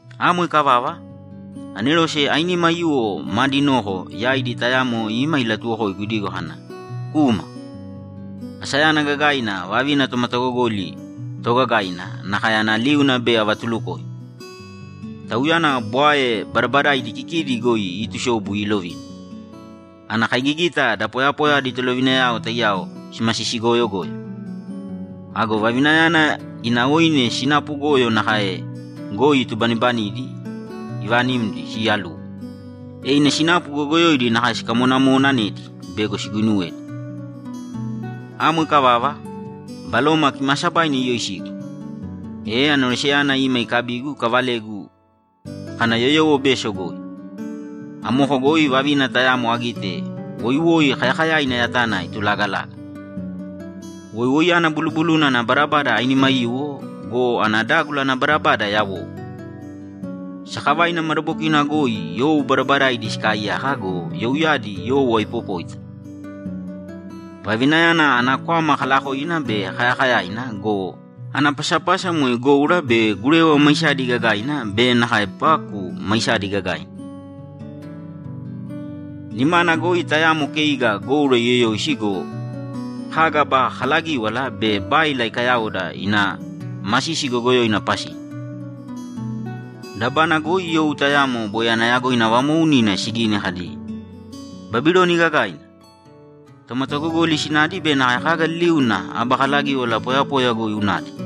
Amo ikavava, anerose ainima aiyuwo maadi noko yaidi tayamo ima ilatuwokoigu idigo kana, ‘Kūma! Asayana gagaina vavina tomatagogoli toogagaina nakae ana liuna bei avatulukoim. Tauyana bwae badabadaidi kikidi goi iitusobu iilovina. Ana kaigigita da poyapoya adi tolovinayao taiyao simasisi goyogoyo. Ago vavinayana ina oine sinapu goyo nakae goi itubanibanidi ivaanimdi siiyaluwo, e ina sinapu goyogoyoidi nakae sikamonamonaanaedi bego siguinuwedi.’ Amo ikavava, Baloma Kimaasabaina iyoisigu, e aneroseyana ima ikabigu ikavalegu kana yoyowo beso goi. Amoko goi vavina tayamo agite woiwoi kayakayaina yatana itulagalaga. Woiwoiyana bulubuluna ana badabada ainima aiyuwo go, ana dágula ana badabada yawou. Sakavaina madabokina goi you badabadaidi sikaaiyaka go, youyadi you aipopóita. Vavinayana ana kwama kalaakovina be kayakayaina go, ana pasapasa moe goura be gurewa maisadi gagaina be nakae paku maisadi gagaina. Nimana goi tayamo keiga goura iyoyoisi go, kaga aba kalagíwala be báila ikayaoda ina masisi goyogoyoina pasina. Dabana goi you tayamo boi ana yagoina vamoounina sigini kadi, ‘Babiloni Gagaina, tomatagogoli sinadi be nakae kaga liliuna aba kalagíwala poyapoya goi unadi.’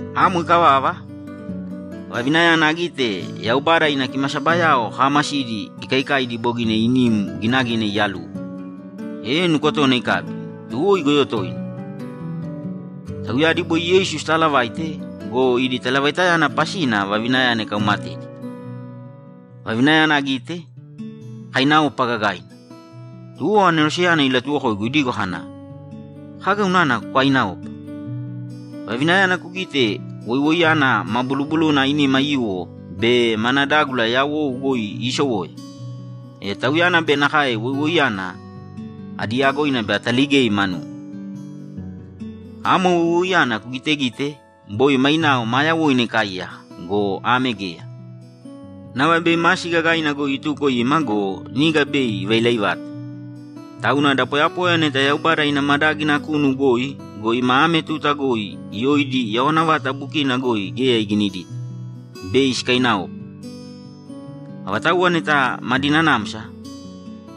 Amo ikavava, vavinayana agite Yaubada ina kimasabayao kaamasidi ikaikaidi bogina inim ginagina iyaluwo, e nukotona ikabi, to igoyo toina. Tauyadi boi Yeisu sitaalavaite go, idi talavaita pasina vavinayana ikaumatedi. Vavinayana agite, akainaopa gagaina. Tuwo aneroseyana ilatuwokoigu idigo kana, ‘Kaga unana kukaiinaopa? Vavinayana kugite woiwoiyana ma bulubuluna ainima aiyuwo be mana dágula yawou goi iisowoya, e tauyana be nakae woiwoiyana adi yagoina bei ataligei manum. Amo woiwoiyana kugitegite boi mainao maa yawoina ikaaiyaka go, ame geya, nava bei masi gagaina goi ituko ima go, niga bei ivailai vata. Tauna da poyapoya neta Yaubada ina madágina kunu goi go, ima ame tuta yoidi yawana vata bukina sinaena geya iginidita, bei sikainaopa. Avatauwa neta madi nanamsa,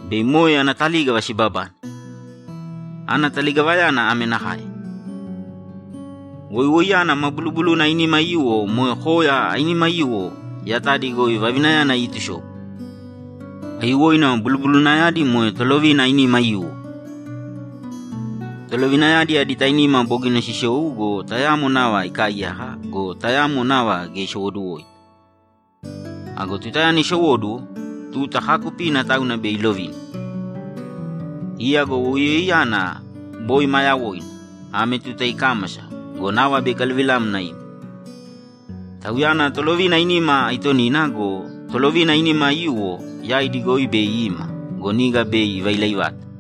bei moe ana talígava sibabane. Ana taligavayana ame nakae: Woiwoiyana ma bulubuluna ainima aiyuwo moe koya ainima aiyuwo yatadi goi vavinayana iitusobu. Aiyuwoina bulubulunayadi moe tolovina ainima aiyuwo. Tolovinayadi adi tainima bogina sisou go, tayamo nava ikaaiyaka go, tayamo nava geya isowoduwoita. Ago tutayana isowóduwo, tuta kaakupina tauna bei ilovina. Iya go woiwoiyana boi ma yawoina, ame tuta ikámasa go, nava bei ikaluvilamna ima. Tauyana tolovina ainima aitonina go, tolovina ainima aiyuwo yaidi goi bei ima go, niga bei ivailai vata.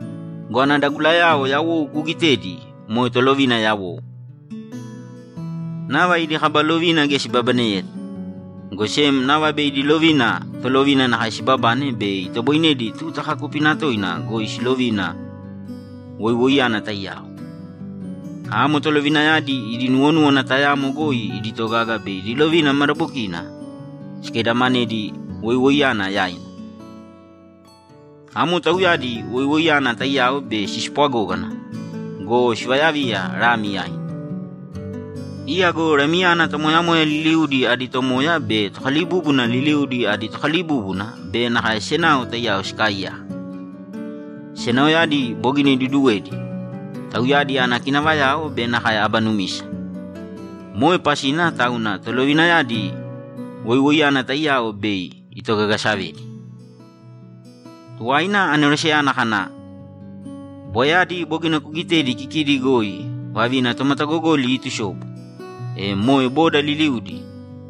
Go ana dagulayao yawou kuugitedi moe tolovina yawou. Nava idi kaba lovina geya sibabaneyeta, go sem nava bei idi lovina tolovina nakae sibabane bei itoboinedi tuta kaakupina toina goi silovina woiwoiyana taiyao. Amo tolovinayadi idi nuwonúwana tayamo goi idi togaga be idi lovina madabokina sikaidamanedi woiwoiyana yaina. Amo tauyadi woiwoiyana taiyao bei sispwagógana go, sivayaviya Lami yaina. Iya go Lamiyana tomoyamoya liliudi adi Tomoya be tokalibúbuna liliudi adi Tokalibúbuna be nakae senao taiyao sikaaiyaka, senaoyadi bogina iduduwedi, tauyadi ana kinavayao be nakae aba numisa. Moe pasina tauna tolovinayadi woiwoiyana taiyao bei itogagasavedi.’ Tuwaina aneroseyana kana, ‘Bwaeyadi bogina kugitedi kikidi goi vavina tomatagogoli iitusobu, e moe boda liliudi,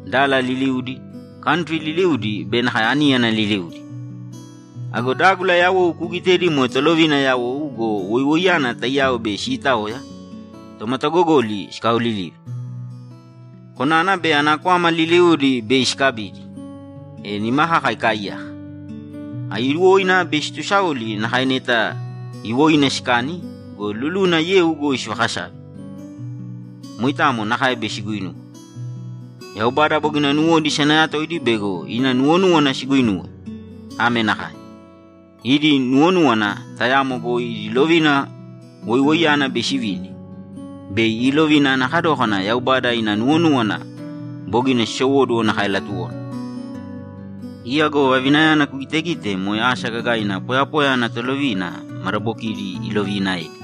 dala liliudi, kantri liliudi be nakae aníyana liliudi. Ago dágula yawou kuugitedi moe tolovina yawou go, woiwoiyana taiyao bei sitaoya, tomatagogoli sikaolilive. Konana be ana kwama liliudi bei sikabidi, e nima kaka ikaaiyaka. Aiyuwoina bei situsaoli nakae neta iwoina sikani go, luluna yeu goi sivakasave. Moitamo nakae bei siguinuwe. Yaubada bogina nuwodi isanayatoidi bego ina nuwonúwana siguinuwe. Ame nakae: Idi nuwonúwana tayamo goi idi lovina woiwoiyana bei sivini. Bei iilovina ana kadókana Yaubada ina nuwonúwana bogina sisowóduwo nakae latuwona. Iya go vavinayana kugitegite moe asa gagaina poyapoya ana tolovina madabokidi iloviinaedi.’